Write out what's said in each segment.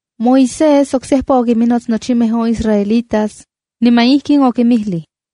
Moisés oksejpa okinminots nochimej on israelitas, niman ijkin okinmijlij: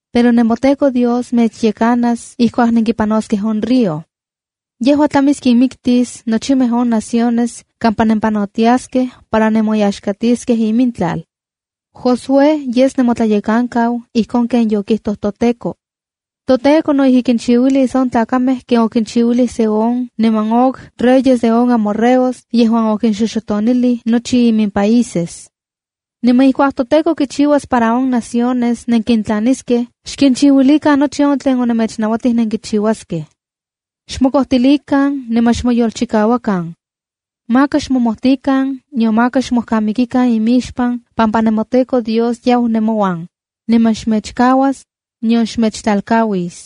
Pero nemoTEKO Dios mechyekanas ijkuak nenkipanoskej on río. Yejua tlamis kinmiktis nochimej on naciones kampa nempanotiaskej para nemoyaxkatiskej imintlal. Josué yes nemotlayekankau ijkon ken yokijtoj toTEKO. ToTEKO no ijki kinchiuilis on tlakamej ken okichiuilij Sehon niman Og reyes de on amorreos yejuan okinxoxotonilij nochi imimpaíses. Niman ijkuak toTEKO kichiuas para on naciones nenkintlaniskej, xkinchiuilikan nochi on tlen onemechnauatij nenkichiuaskej. Xmokojtilikan niman xmoyolchikauakan. Maka xmomojtikan, nion maka xmojkamikikan imixpan pampa nemoTEKO Dios yau nemouan, niman xmechkauas, nion xmechtlalkauis.”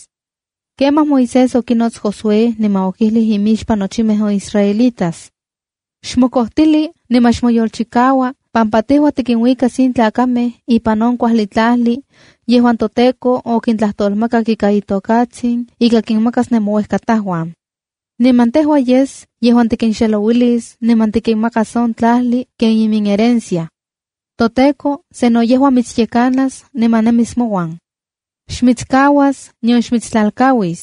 Kemaj Moisés okinots Josué niman okijlij imixpan nochimej on israelitas: “Xmokojtili niman xmoyolchikaua, pampa tejua tikinuikas in tlakamej ipan on kuajli tlajli yejuan toTEKO okintlajtolmakak ika itokatsin ika kinmakas nemouejkatajuan. Niman tejua yes yejuan tikinxelouilis niman tikinmakas on tlajli ken iminherencia. ToTEKO, sano yejua mitsyekanas niman nemis mouan. Xmitskauas, nion xmitstlalkauis.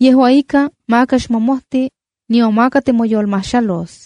Yejua ika, maka xmomojti, nion maka timoyolmajxalos.”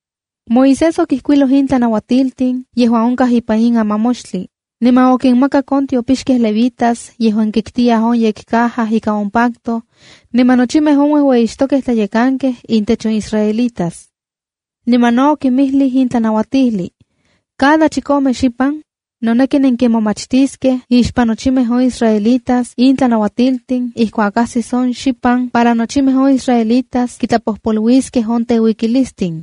Moisés okijkuiloj in tlanauatiltin yejuan onkaj ipan in amamoxtli, niman okinmakak on tiopixkej levitas yejuan kiktiyaj on yekcaja ika on pacto, niman nochimej on uejueyixtokej tlayekankej intech on israelitas. Niman no okinmijlij in tlanauatijli: “Cada chikome xipan, noneki nenkimomachtiskej ixpan nochimej on israelitas in tlanauatiltin ijkuak ajsis on xipan para nochimej on israelitas kintlapojpoluiskej on teuikilistin.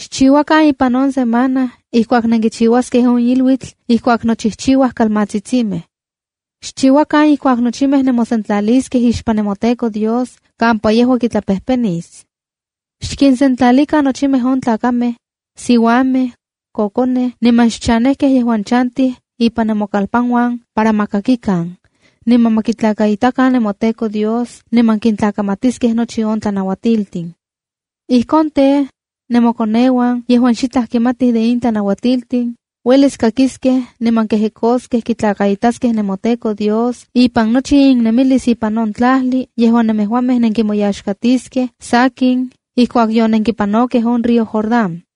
Xchiuakan ipan on semana ijkuak nenkichiuaskej on iluitl ijkuak nochijchiuaj kalmatsitsimej. Xchiuakan ijkuak nochimej nemosentlaliskej ixpan nemoTEKO Dios kampa yejua kitlapejpenis. ’Xkinsentlalikan nochimej on tlakamej, siuamej, kokonej niman xchanejkej yejuan chantij ipan nemokalpanuan para ma kakikan, niman ma kitlakaitakan nemoTEKO Dios, niman kintlakamatiskej nochi on tlanuatiltin. Ijkon tej, nemokoneuan yejuan xitlaj kimatij de in tlanauatiltin, uelis kakiskej niman kejekoskej kitlakaitaskej nemoTEKO Dios ipan nochi innemilis ipan on tlajli yejuan nemejuamej nenkimoyaxkatiskej sakin ijkuak yonenkipanokej on río Jordán.”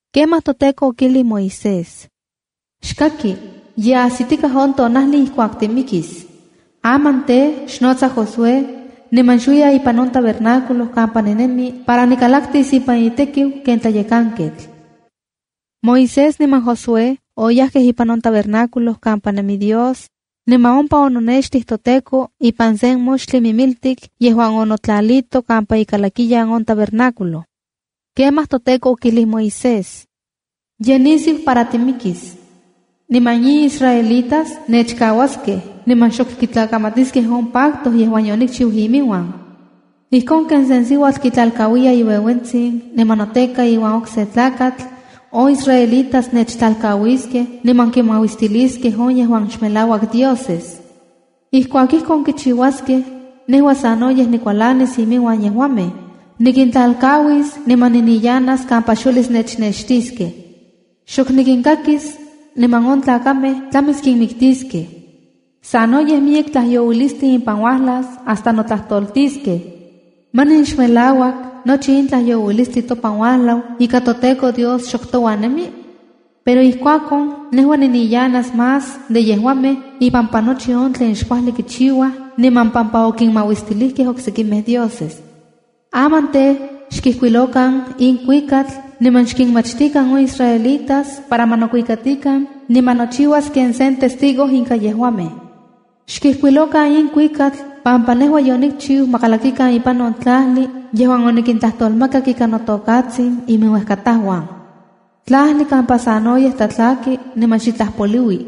Kemaj toTEKO okijlij Moisés: “Xkaki, ye ajsitikaj on tonajli ijkuak timikis. Aman tej, xnotsa Josué, niman xuiya ipan on tabernáculo kampa ninemi para nikalaktis ipan itekiu ken tlayekanketl.” Moisés niman Josué oyajkej ipan on tabernáculo kampa nemi Dios, niman ompa ononextij toTEKO ipan sen moxtli mimiltik yejuan onotlalito kampa ikalakiyan on tabernáculo. Kemaj toTEKO okijlij Moisés: “Ye nisiu para timikis. Niman in israelitas nechkauaskej niman xok kitlakamatiskej on pacto yejuan yonikchiu iminuan. Ijkon ken se siuatl kitlalkauiya iueuentsin niman noteka iuan okse tlakatl, on israelitas nechtlalkauiskej niman kinmauistiliskej on yejuan xmelauak dioses. Ijkuak ijkon kichiuaskej, nejua sanoyej nikualanis iminuan yejuamej. Nikintlalkauis niman niniyanas kampa xuelis nechnextiskej. Xok nikinkakis, niman on tlakamej tlamis kinmiktiskej. Sanoyej miyek tlajyouilistli impan uajlas hasta notlajtoltiskej: ‘¿Manin xmelauak nochi in tlajyouilistli topan uajlau ika toTEKO Dios xok touan nemi?’ Pero ijkuakon nejua niniyanas más de yejuamej ipampa nochi on tlen xkuajli kichiuaj niman pampa okinmauistilijkej oksekimej dioses. ’Aman tej, xkijkuilokan in kuikatl niman xkinmachtikan on israelitas para ma nokuikatikan niman nochiuas ken sen testigo inka yejuamej. Xkijkuilokan in kuikatl pampa nejua yonikchiu ma kalakikan ipan on tlajli yejuan onikintlajtolmakak ika notokatsin iminuejkatajuan. Tlajli kampa sanoyej tlatlaki niman xitlaj poliui.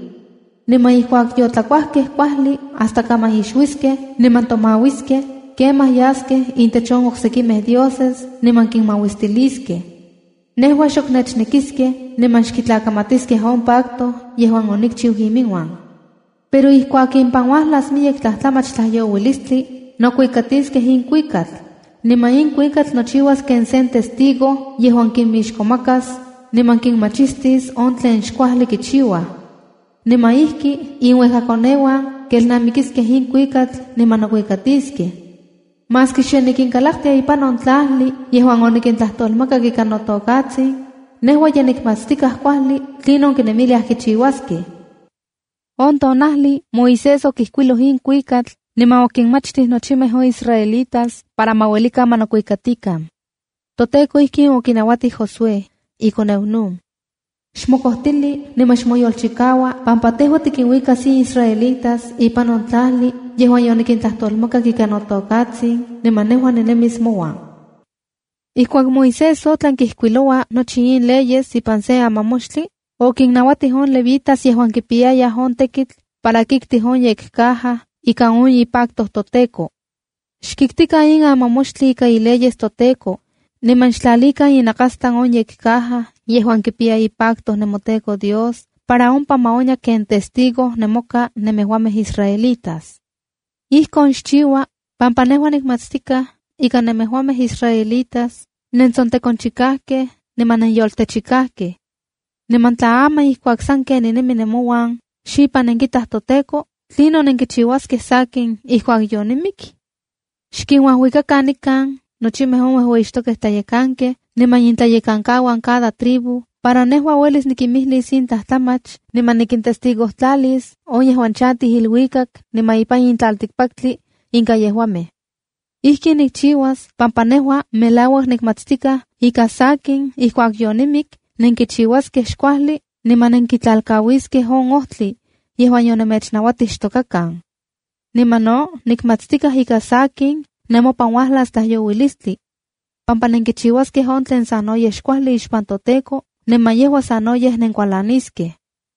Niman ijkuak yotlakuajkej kuajli hasta kaman ixuiskej niman tomauiskej, kemaj yaskej intech on oksekimej dioses niman kinmauistiliskej. Nejua xok nechnekiskej niman xkitlakamatiskej on pacto yejuan onikchiu iminuan. Pero ijkuak impan uajlas miyek tlajtlamach tlajyouilistli, nokuikatiskej in kuikatl. Niman in kuikatl nochiuas ken sen testigo yejuan kinmixkomakas, niman kinmachistis on tlen xkuajli kichiuaj. Niman ijki inuejkakoneuan kelnamikiskej in kuikatl niman nokuikatiskej. Maski xe nikinkalaktia ipan on tlajli yejuan onikintlajtolmakak ika notokatsin, nejua ye nikmatstikaj kuajli tlinon kinemiliaj kichiuaskej.” On tonajli Moisés okijkuiloj in kuikatl niman okinmachtij nochimej on israelitas para ma uelikan ma nokuikatikan. ToTEKO ijkin okinauatij Josué, ikoneu Nun: “Xmokojtili niman xmoyolchikaua pampa tejua tikinuikas in israelitas ipan on tlajli yejuan yonikintlajtolmakak ika notokatsin niman nejua ninemis mouan.” Ijkuak Moisés otlan kijkuiloua nochi in leyes ipan sen amamoxtli, okinnauatij on levitas yejuan kipiyayaj on tekitl para kiktij on yekcaja ika on ipacto toTEKO: “Xkiktikan in amamoxtli ika ileyes toTEKO, niman xtlalikan inakastlan on yekcaja yejuan kipiya ipacto nemoTEKO Dios para ompa ma onya ken testigo nemoka nemejuamej israelitas. ’Ijkon xchiua pampa nejua nikmatstikaj ika nemejuamej israelitas nentsotekonchikajkej niman nenyoltechikajkej. Niman tla aman ijkuak sanken ninemi nemouan xipan nenkitaj toTEKO, ¿tlinon xnenkichiuaskej sakin ijkuak yonimik? Xkinuajuikakan nikan nochimej on uejueyixtokej tlayekankej niman intlayekankauan cada tribu para nejua uelis nikinmijlis in tlajtlamach niman nikintestigojtlalis on yejuan chantij iluikak niman ipan in tlaltikpaktli, inka yejuamej. Ijkin nikchiuas pampa nejua melauak nikmatstikaj ika sakin ijkuak yonimik nenkichiuaskej xkuajli niman nenkitlalkauiskej on ojtli yejuan yonemechnauatij xtokakan. Niman no nikmatstikaj ika sakin nemopan uajlas tlajyouilistli, pampa nenkichiuaskej on tlen sanoyej xkuajli ixpan toTEKO niman yejua sanoyej nenkualaniskej.”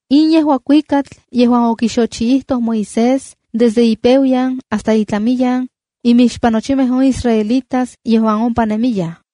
In yejua kuikatl yejuan okixochiijtoj Moisés desde ipeuayan hasta itlamiyan, imixpan nochimej on israelitas yejuan ompa nemiyaj: